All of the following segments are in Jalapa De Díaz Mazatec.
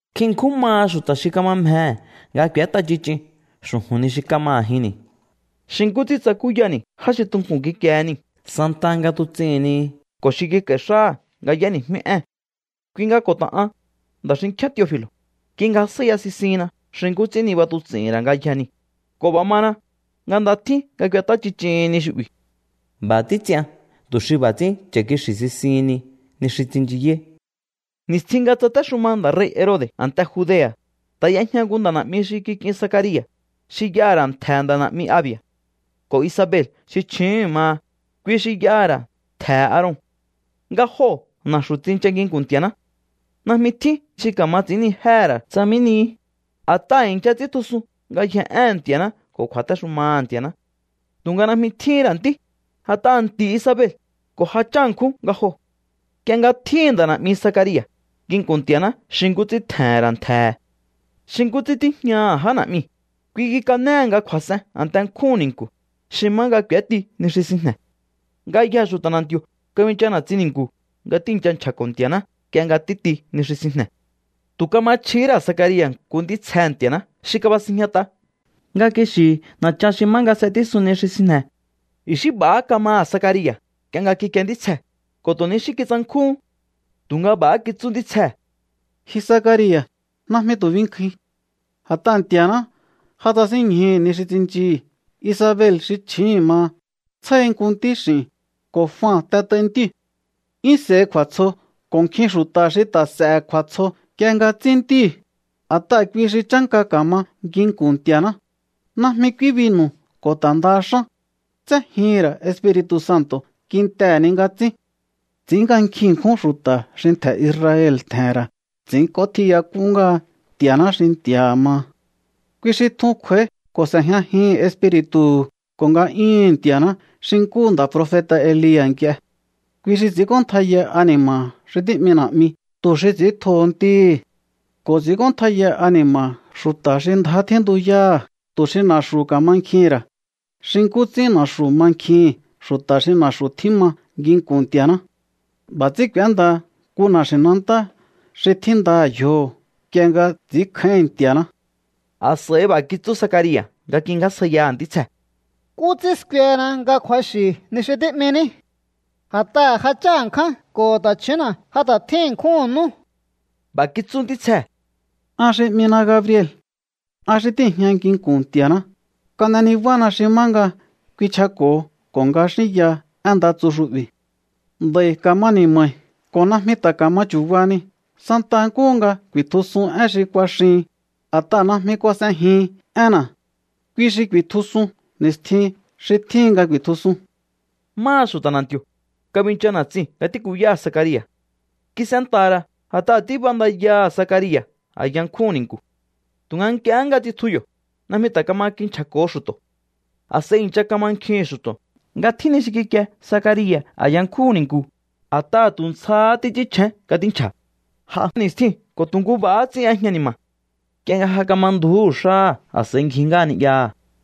Nkjin ṉkjún maha xu̱ta̱ xi kama mjehe̱ nga k'u̱ét'a ch'ich'in xu̱ju̱n ni xi kama a̱jinni̱, xi nkú ts'ín tsakúyani̱ já xi tunku̱n kikiehe niu̱ santaha nga tuts'ihi̱n ni ko̱ xi kik'a̱i̱ xáha̱ nga y'éni̱jmí ée̱n. Kui nga ko̱ ta̱ an, nda̱ xinkjíán Teofi̱lo̱, kingjasjáíya sisihinna xi nkú ts'ín niba tuts'i̱hi̱n ra̱ ngayjee̱ niu̱, ko̱ b'a̱ mana nga nda tjín nga k'uet'á ch'ich'ihin ni xu'bi̱. B'a̱ títs'ian tu̱ xi b'a̱ ts'ín cha̱ kixi̱ sisihinni ni xi tsinchiyáí. Ni̱stjin nga tsatéxuma nda̱ rei̱ Herode̱ a̱nte Judea̱, ta̱ y'ejña nku nda̱ na̱'mi xi kik'in Zacaria̱ xi y'aha̱ ra̱ ntje̱he̱ nda̱ na̱'mi Abia̱. Ko̱ Isabel xi chju̱úhu̱n maha, kui xi y'aha̱ ra̱ ntje̱he̱ Aaron. Nga joo̱ na̱xu̱ tsincha nginku̱n Nti̱a̱ná. Najmi tjín xi ka̱ma ts'i̱ínnijéhe̱ ra̱ tsa mí nihi, a̱t'aha̱ i̱ncha ts'íntjusun ngayjee̱ éhe̱n Nti̱a̱ná ko̱ kju̱a̱téxumaha̱ Nti̱a̱ná. Tu̱nga najmi tjíhín ra̱ ntí, a̱t'aha̱ nti̱ Isabel ko̱ ja chá ṉkjún nga joo̱. Nk'ie nga tjíhi̱n nda̱ na̱'mi Zacaria̱ nginku̱n Nti̱a̱ná xi nkú ts'ín tje̱he̱n ra̱ ntje̱he̱ xi nkú ts'ín tíjñaha̱ já na̱'miu̱, kui kikanéhe̱ nga kju̱a̱s'en a̱nte nkjúhu̱n ni̱nku̱ xi má nga k'u̱éti ni xi sinjne̱. Ngayjee̱ xu̱ta̱ na̱nti̱o̱ kabincha na̱tsin ni̱nku̱ nga tíi̱ncha nchja̱ko̱ Nti̱a̱ná nk'ie nga títi ni xi sinjne̱. Tu̱ kama chjihí ra̱ Zacaria̱ nku ntítsjehe̱ Nti̱a̱ná xi kabasinjñat'a nga kixi̱hi̱ na̱chan xi má nga s'etísun ni xi sinjne̱. I̱xí b'a̱há kamaha̱ Zacaria̱ nk'ie nga kikie ntítsjee̱ ko̱ tu̱ ni xí kitsankjúhún. Tu̱nga b'a̱há kitsú ntítsjee̱: —Ji Zacaria̱, najmi tu̱ binkjuin. A̱t'aha̱ Nti̱a̱ná ja tsasínñjuhu̱ ni xi tsinchihi̱. Isabel xi chji̱íhi̱n maha tsjáhi nku ntíx'i̱n, ko̱ Jua t'et'aihi̱ ntíu̱. 'Yún s'e̱hi kju̱a̱tsjo ko̱ nkjin xu̱ta̱ xi ta̱ s'e̱he̱ kju̱a̱tsjo nk'ie nga tsín ntíhi̱, a̱t'aha̱ kui xi chánka ka̱ma nginku̱n Nti̱a̱ná. Najmi k'úí binu̱ ko̱ ta̱ ndaha xán. Tséjihi̱n ra̱ Espiri̱tu̱ Santo̱ kintehe̱ ni nga tsín. ’Ts'i̱ín nga nkjin ṉkjún xu̱ta̱ xi ntje̱ Israel tje̱he̱n ra̱ ts'i̱ínk'ótjiyak'un ngáha Nti̱a̱ná xi Nti̱a̱ha̱ maha. Kui xi tjun kj'u̱a̱í ko̱ s'e̱jñajihi̱n Espiri̱tu̱hu̱ ko̱ nga'yúhu̱n Nti̱a̱ná xi nkúhu nda̱ profeta̱ Elia̱ nk'ie. Kui xi ts'i̱ínk'óntjaiya ani̱ma̱ha̱ xi tí'mi na̱'mi tu̱ xi ts'i̱íntjoho ntíhi̱. Ko̱ ts'i̱ínk'óntjaiya ani̱ma̱ha̱ xu̱ta̱ xi ndjá tjíntuyáha̱ tu̱ xi na̱xu̱ ka̱mankjihi̱n ra̱ xi nkú ts'ín na̱xu̱ mankjihi̱n xu̱ta̱ xi na̱xu̱ tjíma nginku̱n Nti̱a̱ná. B'a̱ ts'ín k'u̱éndaha nku na̱xi̱nantá xi tjíndaha̱ yjoho̱ nk'ie nga ts'i̱ínkjáíhi̱n Nti̱a̱ná. A̱s'a̱i b'a̱ kitsú Zacaria̱ nga kingjásjaiyaha̱ ntítsjee̱: —¿Nkú ts'ín skuehena nga kju̱axi̱ ni xi tí'miní? A̱t'aha̱ ja chá ṉkján ko̱ ta̱chju̱únna̱ ja ta̱ tjín ṉkjúhu̱n nú. B'a̱ kitsú ntítsjee̱: —An xi 'mina Gabriel. An xi tíi̱jña nginku̱n Nti̱a̱ná. Kan'e nibána xi má nga kuinchjako̱ho ko̱ nga xínyaha én nda tsu xu'bi̱. Nd'a̱i̱ ka̱ma ni̱ma̱i ko̱ najmi ta̱ ka̱ma chu̱bahani santa nkúhu nga ku̱i̱tjusun én xi kuaxihin, a̱t'aha̱ najmi kuas'ejihin énna̱. Kui xi ku̱i̱tjusun ni̱stjin xi tjíhin nga ku̱i̱tjusun. Máha xu̱ta̱ na̱nti̱o̱, kabincha na̱tsiu̱n nga tíkuyáha̱ Zacaria̱. Kis'enta̱ha̱ ra̱ a̱t'aha̱ tíb'andayaha̱ Zacaria̱ a̱ya nkjúhu̱n ni̱nku̱. Tu̱nga nk'iehé nga tsitju yo̱, najmi ta̱ kama kinchja̱ko̱ho xu̱to̱. A̱s'a̱i i̱ncha kamankjihi̱n xu̱to̱ nga tjín ni xi kikie Zacaria̱ a̱ya nkjúhu̱n ni̱nku̱, a̱t'aha̱ tu̱ ntsjahá títs'ínchjén nga tínchja̱. J'a ni̱stjiu̱n ko̱ tu̱ nku b'a̱há ts'ín y'ejña ni̱ma̱. Nk'ie nga ja kama ndju̱ú xáha̱, a̱s'a̱i ngji ngáha ni'yaha.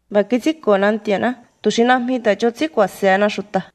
“B'a̱ kits'ínko̱na Nti̱a̱ná tu̱ xi najmi ta̱ ch'on ts'ín ku̱a̱se̱hena xu̱ta̱.”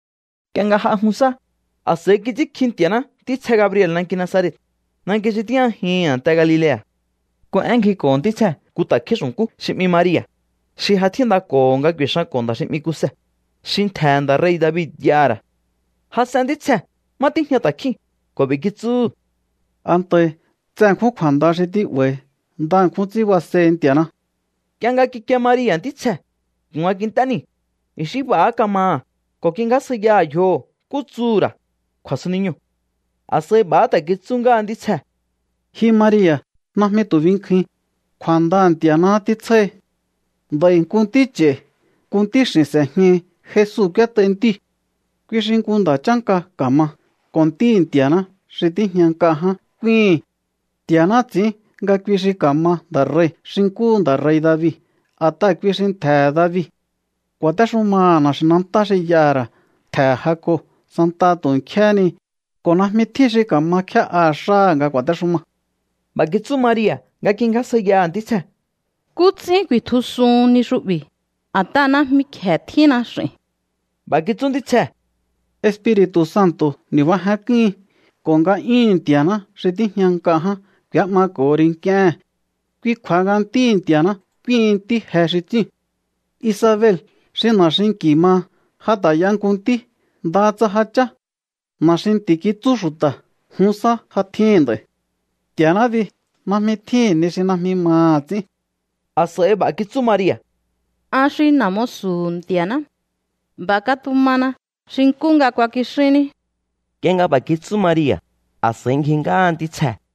Nk'ie nga j'a jun sá, a̱s'a̱i kits'ínkji Nti̱a̱ná ntítsje Gabriel nanki Nazaret, nanki xi tíjñajihi̱n a̱nte Galilea̱. Nku én ngjiko̱ho̱ ntítsjee̱ nku ta̱kjín xu̱nkú xi 'mi Maria̱, xi ja tjíndako̱ho̱ nga ku̱i̱xanko̱ nda̱ xi 'mi Kuse, xi ntje̱he̱ nda̱ rei̱ David y'aha̱ ra̱. Jas'en ntítsjee̱ má tíjña ta̱kjíu̱n ko̱ b'i̱ kitsúhu̱: —Antahi. Tse ṉkjún kju̱a̱nda xi tí'ba̱i̱hi. Nda ṉkjún ts'ín basehi Nti̱a̱ná. Nk'ie nga kikie Maria̱ ntítsjee̱ ko̱ nga kint'é niu̱, i̱xí b'a̱há kamaha̱ ko̱ kingjásjaiyaha̱ yjoho̱ nkú tsuhu̱ ra̱ kju̱a̱suniñoo̱. A̱s'a̱i b'a̱há ta̱ kitsú ngáha ntítsjee̱: —Ji Maria̱, najmi tu̱ binkjuin. Kju̱a̱ndaha̱ Nti̱a̱ná títsjáhi. Nd'a̱i̱ nku ntí ch'a̱i̱, nku ntíx'i̱n s'e̱jñahi. Jesu k'úét'aihi̱ ntíu̱. Kui xi nku nda̱ chánka ka̱ma ko̱ Ntíhi̱ Nti̱a̱ná xi tíjña nk'a ján k'úíhi̱n. Nti̱a̱ná ts'i̱ín nga kui xi ka̱ma nda̱ rei̱ xi nkúhu nda̱ rei̱ David, a̱t'aha̱ kui xi ntje̱he̱ David. Ku̱a̱téxumaha̱ na̱xi̱nantá xi y'aha̱ ra̱ ntje̱he̱ Jacob santaha tu̱ nkjéhé ni ko̱ najmi tjín xi ka̱ma kjé'aha̱ xáha̱ nga ku̱a̱téxuma. B'a̱ kitsú Maria̱ nga kingjásjaiyaha̱ ntítsjee̱: —¿Nkú ts'ín ku̱i̱tjusuhun ni xu'bi̱? A̱t'aha̱ najmi kje̱ tjínna x'i̱n. B'a̱ kitsú ntítsjee̱: —Espiri̱tu̱ Santo̱ ni̱bajenk'úhin ko̱ nga'yúhu̱n Nti̱a̱ná xi tíjña nk'a ján k'u̱é'mako̱ho ri nk'íéhe̱n. Kui kju̱a̱ha nga Ntíhi̱ Nti̱a̱ná k'úíhin ntí je xi tsíu̱n. Isabel xi na̱ xinki̱ maha ja ta̱ y'a nku ntí, ndaha tsa ja chá. Na̱ xi nti̱ kitsú xu̱ta̱ jun sá ja tjíhi̱n nd'a̱i̱. Nti̱a̱ná bi najmi tjíhi̱n ni xi najmi maha̱ ts'ín. A̱s'a̱i b'a̱ kitsú Maria̱: —An xi na̱ musu̱hu̱ Nti̱a̱ná. B'a̱ katumana xi nkú nga kuakixínní. Nk'ie nga b'a̱ kitsú Maria̱, a̱s'a̱i ngji ngáha ntítsjee̱.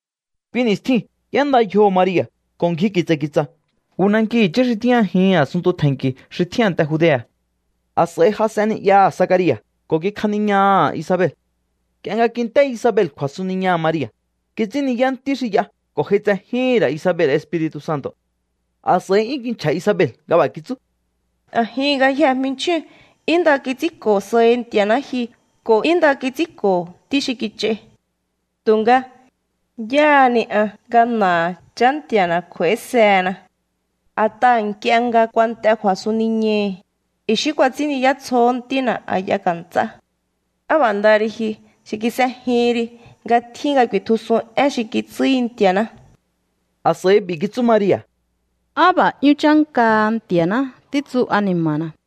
Kui ni̱stjiu̱n y'énda yjoho̱ Maria̱ ko̱ ngji ki̱tsa̱ ki̱tsa̱ nku nanki i̱chí xi tíjñajihi̱n a̱sunntu tje̱nki̱ xi tjín a̱nte Judea̱. A̱s'a̱i jas'en ni'yaha̱ Zacaria̱ ko̱ kikjaniñaha̱ Isabel. Nk'ie nga kint'é Isabel kju̱a̱suniñaha̱ Maria̱, kits'ín ni̱yá ntí xi y'a ko̱ j'aitsejíhi̱n ra̱ Isabel Espiri̱tu̱ Santo̱. A̱s'a̱i 'yún kinchja̱ Isabel nga b'a̱ kitsú: —A̱jihi̱n ngayjehe̱ jmichjíu̱n 'yún nda kits'ínko̱ sahi Nti̱a̱ná ji ko̱ 'yún nda kits'ínko̱ ntí xi kich'ai. Tu̱nga, ¿yáhá ni an nga na̱aha̱ Chá Nti̱a̱na̱ kj'uaisehena? A̱t'aha̱ nk'ie nga kuant'e kju̱a̱suniñahi̱, i̱xí kuats'ín ni̱yá tsjoho̱ ntína̱ a̱ya ka̱nts'á. Á b'a̱ ndaha ri ji xi kis'ejihin ri nga tjíhin nga ku̱i̱tjusun én xi kitsúhi Nti̱a̱ná. A̱s'a̱i b'i̱ kitsú Maria̱: A b'a̱ 'yún chánkaha Nti̱a̱ná títsu ani̱ma̱na̱.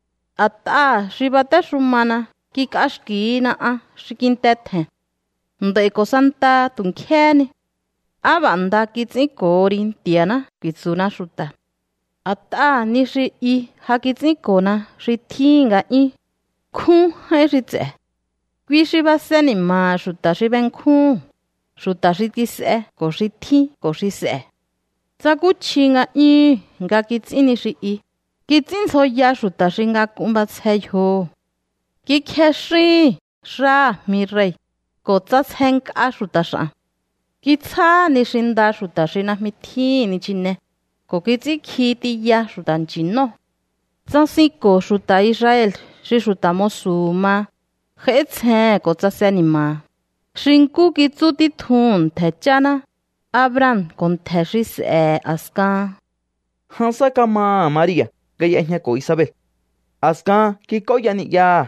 A̱t'aha̱ xi batéxumana kik'axki̱hina an xi kinte tje̱n. Nd'a̱i̱ ko̱ santaha tu̱ nkjéhé ni: “Á b'a̱ nda kits'ínko̱ho ri Nti̱a̱ná”, ku̱i̱tsu̱na xu̱ta̱. A̱t'aha̱ ni xi i ja kits'ínko̱na xi tjíhi̱n nga'yún. Nkjún j'áín xi ts'e̱. Kui xi base ni̱ma̱ha̱ xu̱ta̱ xi benkjúhu̱n, xu̱ta̱ xi kis'e ko̱ xi tjín ko̱ xi s'e̱. Tsakúchji nga'yúhu̱n nga kits'ín ni xi i. Kits'ínndzjoya xu̱ta̱ xi ngak'un b'asje yjoho̱. Kikjexíhi̱n xáha̱ jmirei̱, ko̱ ts'asjenk'a xu̱ta̱ x'a̱n. Kitsjáha̱ ni xi nda xu̱ta̱ xi najmi tjíhi̱n nichine, ko̱ kits'ínkji tiya xu̱ta̱ nchi̱nóo̱. Tsasinko̱ xu̱ta̱ Israel xi xu̱ta̱ musu̱hu̱ maha, j'áítsjehe̱n ko̱ tsase ni̱ma̱ha̱, xi nkú kitsú títjuhu̱n ntje̱ cháná, Abraham ko̱ ntje̱ xi s'e̱he̱ a̱skahan. Jan sá kamaha̱ Maria̱ nga y'ejñako̱ Isabel. A̱skahan kik'óya ni'yaha.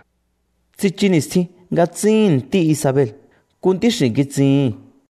Tsichu ni̱stjin nga tsíhi̱n ntí Isabel. Nku ntíx'i̱n kitsihi̱n.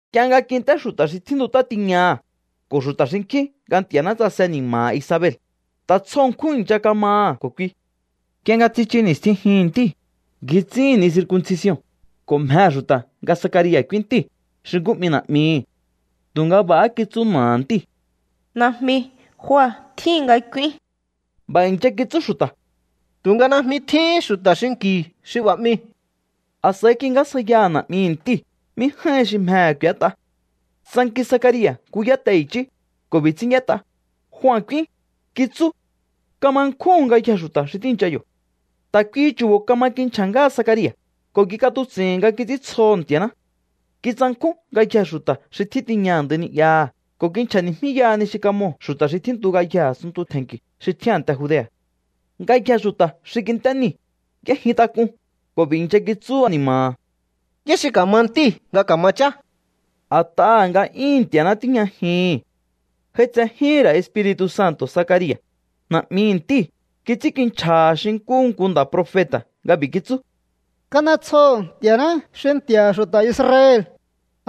Nk'ie nga kint'é xu̱ta̱ xi tjíntut'á tiñaha̱ ko̱ xu̱ta̱ xinkjín nga Nti̱a̱ná tsase ni̱ma̱ha̱ Isabel, ta̱ tsjo ṉkjún i̱ncha kamaha̱ ko̱ kui. Nk'ie nga tsichu ni̱stjin jihi̱n ntíu̱, ngji ts'íhi̱n ni circuncision ko̱ mjehe̱ xu̱ta̱ nga Zacaria̱ k'úín ntíu̱ xi nkú 'mi na̱'mihi̱. Tu̱nga b'a̱há kitsú na̱aha̱ ntíu̱: —Najmi. Jua tjíhin nga k'úín. B'a̱ i̱ncha kitsú xu̱ta̱: —Tu̱nga najmi tjíhín xu̱ta̱ xinki̱u xi b'a̱ 'miu̱. A̱s'a̱i kingjásjaiyaha̱ na̱'mihi̱ ntíu̱ mí j'áíhin xi mjehe̱ k'u̱ét'a. Tsanki Zacaria̱ nku yáte i̱chí ko̱ b'i̱ ts'ín y'ét'a: “Jua k'úín”, kitsú. Kama nkjúhu̱n ngayjee̱ xu̱ta̱ xi tíi̱ncha yo̱. Ta̱ kuihi chu̱bo̱ kama kinchja̱ ngáha Zacaria̱ ko̱ kik'atuts'i̱n nga kits'íntsjoho̱ Nti̱a̱ná. Kitsankjún ngayjee̱ xu̱ta̱ xi tjín tiña a̱ndai ni'yaha̱ ko̱ kinchja̱ni̱jmíyaha ni xi kamoo̱ xu̱ta̱ xi tjíntu ngayjee̱ a̱sunntu tje̱nki̱ xi tjín a̱nte Judea̱. Ngayjee̱ xu̱ta̱ xi kint'é niu̱ y'éjintak'un ko̱ b'i̱ i̱ncha kitsú ani̱ma̱ha̱: —¿Yá xi ka̱ma ntíu̱ nga ka̱ma chá? A̱t'aha̱ nga'yúhu̱n Nti̱a̱ná tíjñajihi̱n. J'aitsejíhi̱n ra̱ Espiri̱tu̱ Santo̱ Zacaria̱, na̱'mihi̱ ntíu̱. Kits'ínkinchja̱ha̱ xi nkúhu nku nda̱ profeta̱ nga b'i̱ kitsú: ¡Kan'etsjoho̱ Nti̱a̱ná xi Nti̱a̱ha̱ xu̱ta̱ Israel,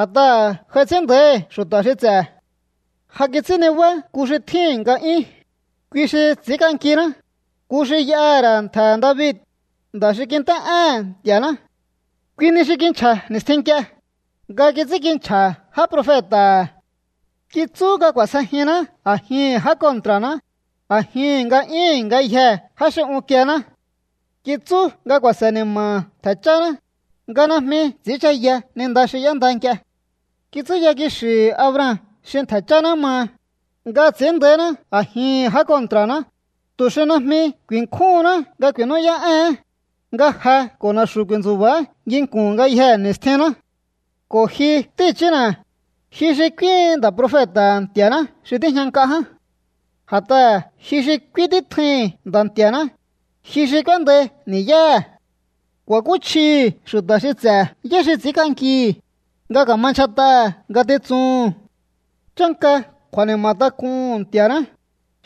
a̱t'aha̱ j'ai ts'ín nda̱íhi̱ xu̱ta̱ xi ts'e̱! Ja kits'ín nibá nku xi tjíhi̱n nga'yún, kui xi ts'i̱ínk'ankiná, nku xi y'aha̱ ra̱ ntje̱he̱ David, nda̱ xi kint'é'éhe̱n Nti̱a̱ná. Kui ni xi kinchja̱ ni̱stjin nk'ie, nga kits'ínkinchja̱ já profeta̱ha̱. Kitsú nga k'u̱a̱sjejinná a̱jihi̱n já kontra̱ná, a̱jihi̱n nga'yúhu̱n ngayjee̱ já xi unkiená. Kitsú nga ku̱a̱se̱ ni̱ma̱ha̱ ntje̱ cháná, nga najmi ts'i̱ínchaya ni nda xi y'énda nk'ie. Kitsúya kixi̱hi̱ Abraham xi ntje̱ cháná maha, nga ts'i̱ín nda̱íná a̱jihi̱n já kontra̱ná, tu̱ xi najmi ku̱i̱nkjúhunná nga ku̱i̱nú'yá'éhe̱én, nga je ko̱ na̱xu̱ ku̱i̱ntsu̱ba̱á nginku̱n ngayjee̱ ni̱stjinná. Ko̱ ji, ntí i̱chína̱, ji xi k'úíhin nda̱ profeta̱ha̱ Nti̱a̱ná xi tíjña nk'a ján. A̱t'aha̱ ji xi k'úín títjuihi̱n Nda̱ Nti̱a̱ná, ji xi k'úéndai ni̱yáha̱. Ku̱a̱kúchjihi̱ xu̱ta̱ xi ts'e̱ yá xi ts'i̱ínk'ankihi̱, nga ka̱ma ndyjat'aha̱ ngatitsuhu̱n. Chánka kju̱a̱ni̱ma̱ tak'uhu̱n Nti̱a̱ná,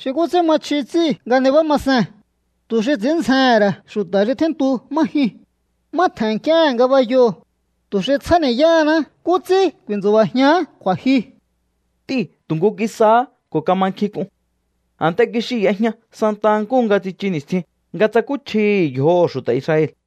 xi nkú ts'ín ma chji ts'íu̱ nga nibá ma see̱n, tu̱ xi ts'i̱ín ndzjehe̱n ra̱ xu̱ta̱ xi tjíntu má jyuu̱n, má tje̱n nk'íéhe̱n ngabayoo̱, tu̱ xi tsjáni̱yáhaná nkú ts'ín ku̱i̱ntsu̱ba̱jián kju̱a̱jyu. Ntíu̱ tu̱ nku kisáhá ko̱ kama nkjink'un. A̱nte kixiu̱ y'ejña santa nkúhu nga tsichu ni̱stjin nga tsakúchjihi̱ yjoho̱ xu̱ta̱ Israel.